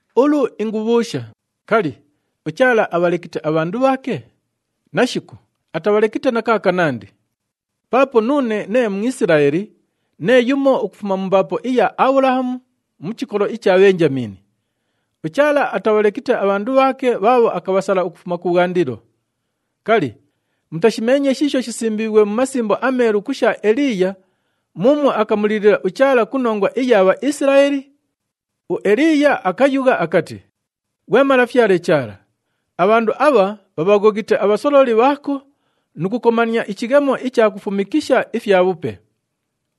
Ulu ingubhuusha, kali, uChaala abhalekite abhandu bhaake? Nashiku, atabhalekite na kaakanandi! Paapo nuune nee Mwisilaeli, nee yumo ukufuma mu mbaapo iya Abhulahamu, mu chikolo icha Bhenjamiini. UChaala atabhalekite abhandu bhaake bhaabho akabhasala ukufuma kubhwandilo. Kali, mutashimeenye shiisho shisimbiighwe mu Masimbo aMeelu ku sha Eliiya muumwo akamulilila uChaala ku nongwa iya Bhaisilaeli? UEliiya akayugha akati, “Ghwe Malafyale Chaala, abhandu abha bhabhaghoghite abhasololi bhaako nu kukomania ichighemo icha kufumikisha ifyabhupe.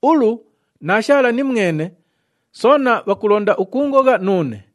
Ulu naashaala nimwene, soona bhakulonda ukuungogha nuune!”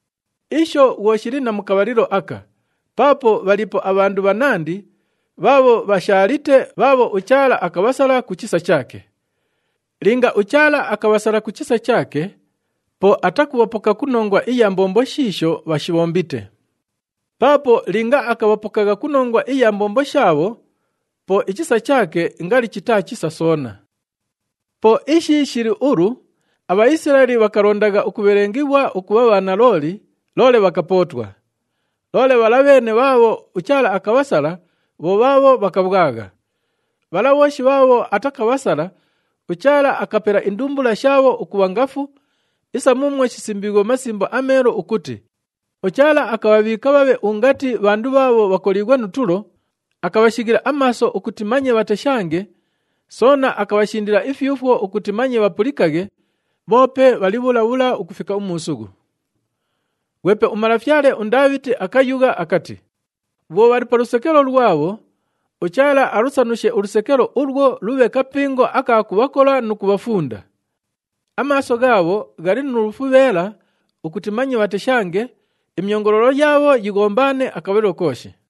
Isho bhwo shili na mu kabhalilo aka, paapo bhaliipo abhandu bhanandi bhaabho bhashaalite bhaabho uChaala akabhasala ku chisa chaake. Linga uChaala akabhasala ku chisa chaake, po atakubhapoka ku nongwa iya mbombo shiisho bhashibhombite. Paapo linga akabhapokagha ku nongwa iya mbombo shaabho, po ichisa chaake ngali chitaa chisa soona. Po ishi shili ulu, aBhaisilaeli bhakalondagha ukubhelengighwa ukubha bhanalooli, loole bhakapootwa. Loole bhala bheene bhaabho uChaala akabhasala bho bhaabho bhakabhwagha. Bhala bhooshi bhaabho atakabhasala, uChaala akapela indumbula shaabho ukubha ngafu, isa muumwo shisimbiighwe mu Masimbo aMeelu ukuti, “UChaala akabhabhiika bhabhe ungati bhandu bhaabho bhakoliighwe nu tulo, akabhashighila amaaso ukuti manye bhateshange, soona akabhashindila ifyufwo ukuti manye bhapulikaghe, bhoope bhali bhula bhula ukufika umuusughu.” Ghwepe umalafyale uNdaabhiti akayugha akati, “Bhwo bhali pa lusekelo lwabho, uChaala alusanushe ulusekelo ulwo, lubhe kapingo aka kubhakola nu kubhafunda. Amaaso ghaabho ghali nu lufubheela ukuti manye bhateshange, imyongoloolo yaabho yighombaane akabhalilo kooshi.”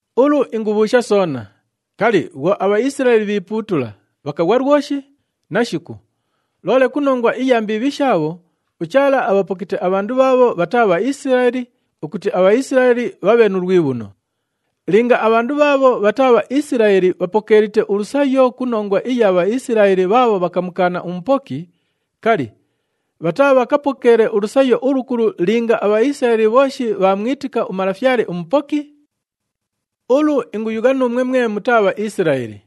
Ulu ingubhuusha soona, kali, bhwo aBhaisilaeli bhiipuutula, bhakaghwa lwoshi? Nashiku! Loole ku nongwa iya mbiibhi shaabho, uChaala abhapokite abhandu bhaabho bhataa Bhaisilaeli ukuti aBhaisilaeli bhabhe nu lwibhuno. Linga abhandu bhaabho bhataa Bhaisilaeli bhapokeelite ulusayo ku nongwa iya Bhaisilaeli bhaabho bhakamukaana uMupoki, kali, bhataabhakapokeele ulusayo ulukulu linga aBhaisilaeli bhooshi bhaamwitika uMalafyale uMupoki? Ulu inguyugha nuumwe mwe mutaa Bhaisilaeli.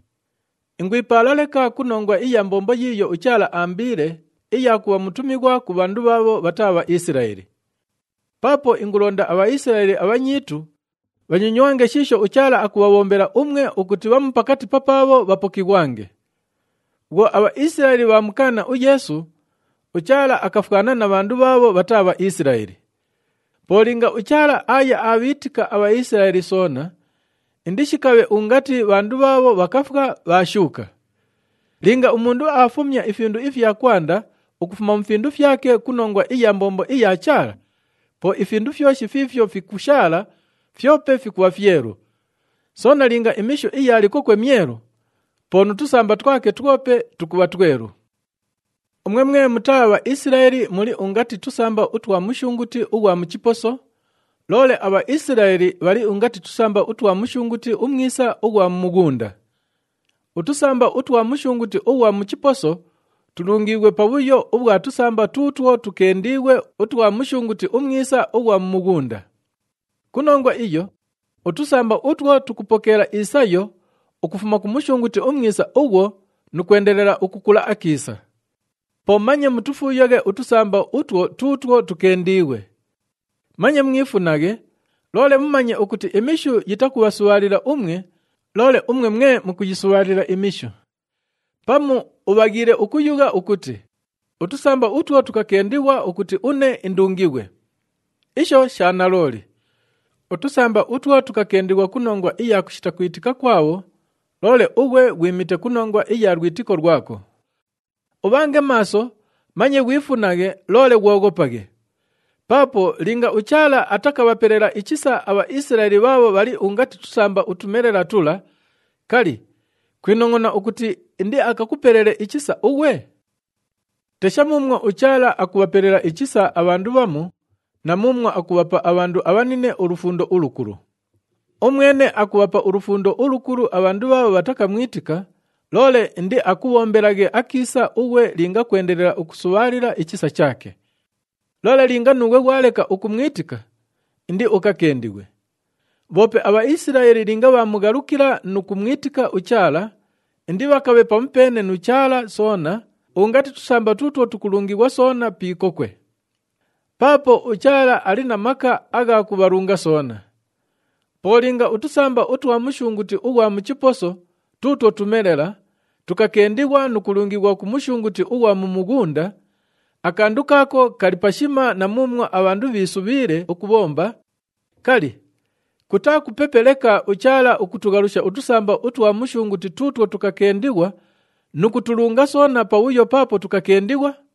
Ingwipaala leka ku nongwa iya mbombo yiiyo uChaala aambiile, iya kubha mutumighwa ku bhandu bhaabho bhataa Bhaisilaeli. Paapo ingulonda aBhaisilaeli abhanyiitu bhanyonywange shiisho uChaala akubhabhombela umwe ukuti bhamu pakati papaabho bhapokighwange. Bhwo aBhaisilaeli bhaamukaana uYeesu, uChaala akafwana na bhandu bhaabho bhataa Bhaisilaeli. Po linga uChaala aaya aabhiitika aBhaisilaeli soona, indishikabhe ungati bhandu bhaabho bhakafwa, bhaashuuka! Linga umundu aafumya ifindu ifya kwanda ukufuma mu findu fyake ku nongwa iya mbombo iya Chaala, po ifindu fyoshi fiifyo fikushaala fyope fikubha fyelu. Soona linga imishu iya likokwe myelu, po nu tusamba twake twope tukubha twelu. Umwe mwe mutaa Bhaisilaeli muli ungati tusamba utwa mushunguti ughwa mu chiposo, loole aBhaisilaeli bhali ungati tusamba utwa mushunguti umwisa ughwa mu mughunda. Utusamba utwa mushunguti ughwa mu chiposo, tulungiighwe pabhuyo ubhwa tusamba tuutwo tukendiighwe utwa mushunguti umwisa ughwa mu mughunda. Ku nongwa iyo, utusamba utwo tukupokeela isayo ukufuma ku mushunguti umwisa ughwo nu kwendelela ukukula akiisa. Po manye mutufuuyaghe utusamba utwo tuutwo tukendiighwe. Manye mwifunaghe, loole mumanye ukuti imishu yitakubhasubhaalila umwe, loole umwe mwe mukuyisubhaalila imishu. Pamu ubhaghiile ukuyugha ukuti, “Utusamba utwo tukakendighwa ukuti une indungighwe.” Isho sha nalooli. Utusamba utwo tukakendighwa ku nongwa iya kushita kwitika kwabho, loole ughwe ghwimite ku nongwa iya lwitiko lwako. Ubhange maaso, manye ghwifunaghe, loole ghwoghopaghe. Paapo linga uChaala atakabhapelela ichisa aBhaisilaeli bhaabho bhali ungati tusamba utumelela tula, kali, kwinongʼona ukuti indiakakupelele ichisa ughwe? Tesha muumwo uChaala akubhapelela ichisa abhandu bhamu na muumwo akubhapa abhandu abhanine ulufundo ulukulu! Umwene akubhapa ulufundo ulukulu abhandu bhaabho bhatakamwitika, loole indiakubhombelaghe akiisa ughwe linga kwendelela ukusubhaalila ichisa chaake. Loole linga nuughwe ghwaleka ukumwitika, indiukakendighwe. Bhoope aBhaisilaeli linga bhaamughalukila nu kumwitika uChaala, indibhakabhe pamupeene nu Chaala soona ungati tusamba tuutwo tukulungighwa soona pi ikokwe. Paapo uChaala ali na maka agha kubhalunga soona. Po linga utusamba utwa mushunguti ughwa mu chiposo tuutwo tumelela, tukakendighwa nu kulungighwa ku mushunguti ughwa mu mughunda, akandu kaako kali pashima na muumwo abhandu bhiisubhiile ukubhomba, kali, kutaa kupepe leka uChaala ukutughalusha utusamba utwa mushunguti tuutwo tukakendighwa nu kutulunga soona pabhuyo paapo tukakendighwa?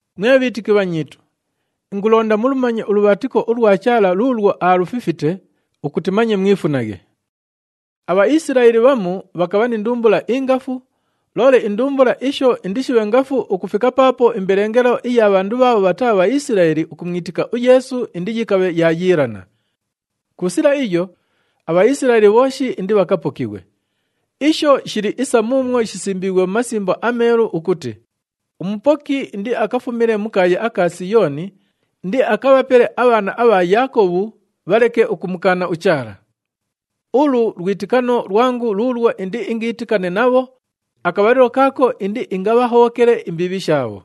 Mwe bhiitiki bhanyiitu, ingulonda mulumanye ulubhaatiko ulwa Chaala luulwo aalufifite, ukuti manye mwifunaghe. ABhaisilaeli bhamu bhakabha ni ndumbula ingafu, loole indumbula isho indishibhe ngafu ukufika paapo imbelengelo iya bhandu bhaabho bhataa Bhaisilaeli ukumwitika uYeesu indiyikabhe yaayiilana. Ku sila iyo, aBhaisilaeli bhooshi indibhakapokighwe. Isho shili isa muumwo shisimbiighwe mu Masimbo aMeelu ukuti, “UMupoki indiakafumile mu kaaya aka Siyooni, indiakabhapele abhaana abha Yaakobhu bhaleke ukumukaana uChaala. Ulu lwitikano lwangu luulwo indiingiitikane nabho akabhalilo kaako indiingabhahobhokele imbiibhi shaabho.”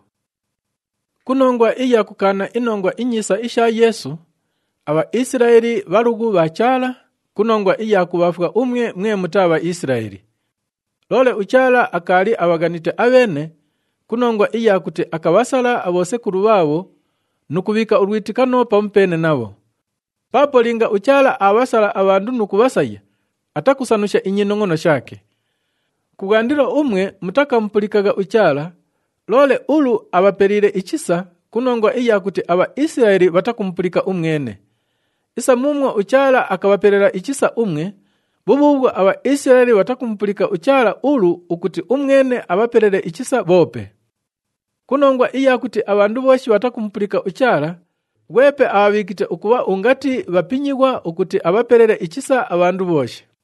Ku nongwa iya kukaana iNongwa iNyiisa isha Yeesu, aBhaisilaeli bhalughu bha Chaala ku nongwa iya kubhaafwa umwe mwe mutaa Bhaisilaeli. Loole uChaala akaali abhaghanite abheene ku nongwa iya kuti akabhasala abhosekulu bhaabho nu kubhiika ulwitikano pamupeene nabho. Paapo linga uChaala aabhasala abhandu nu kubhasaya, atakusanusha inyinongʼono shaake. Kubhwandilo umwe mutakamupulikagha uChaala, loole ulu abhapeliile ichisa ku nongwa iya kuti aBhaisilaeli bhatakumupulika umwene. Isa muumwo uChaala akabhapelela ichisa umwe, bhubhuubhwo aBhaisilaeli bhatakumupulika uChaala ulu, ukuti umwene akabhapelele ichisa bhoope. Ku nongwa iya kuti abhandu bhooshi bhatakumupulika uChaala, ghwepe abhabhiikite ukubha ungati bhapinyighwa ukuti abhapelele ichisa abhandu bhooshi.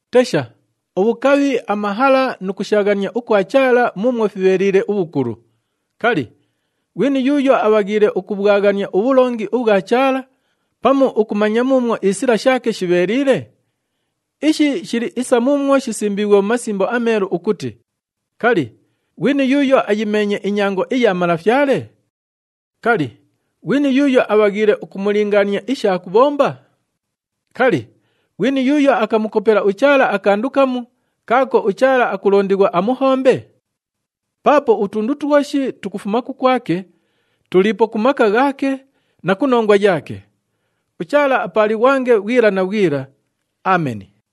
Tesha, ubhukabhi, amahala nu kushaaghania ukwa Chaala muumwo fibheeliile ubhukulu! Kali, ghwini yuuyo abhaghiile ukubhwaghania ubhulongi ubhwa Chaala pamu ukumanya muumwo isila shaake shibheeliile? Ishi shili isa muumwo shisimbiighwe mu Masimbo aMeelu ukuti, “Kali, ghwini yuuyo ayimeenye inyango iya Malafyale? Kali, ghwini yuuyo abhaghiile ukumulingaania isha kubhomba?” “Kali, ghwini yuuyo akamukopela uChaala akandu kamu, kaako uChaala akulondighwa amuhombe?” Paapo utundu twoshi tukufuma kukwake, tuliipo ku maka ghaake na ku nongwa yaake. UChaala apaalighwange bhwila na bhwila. Ameni.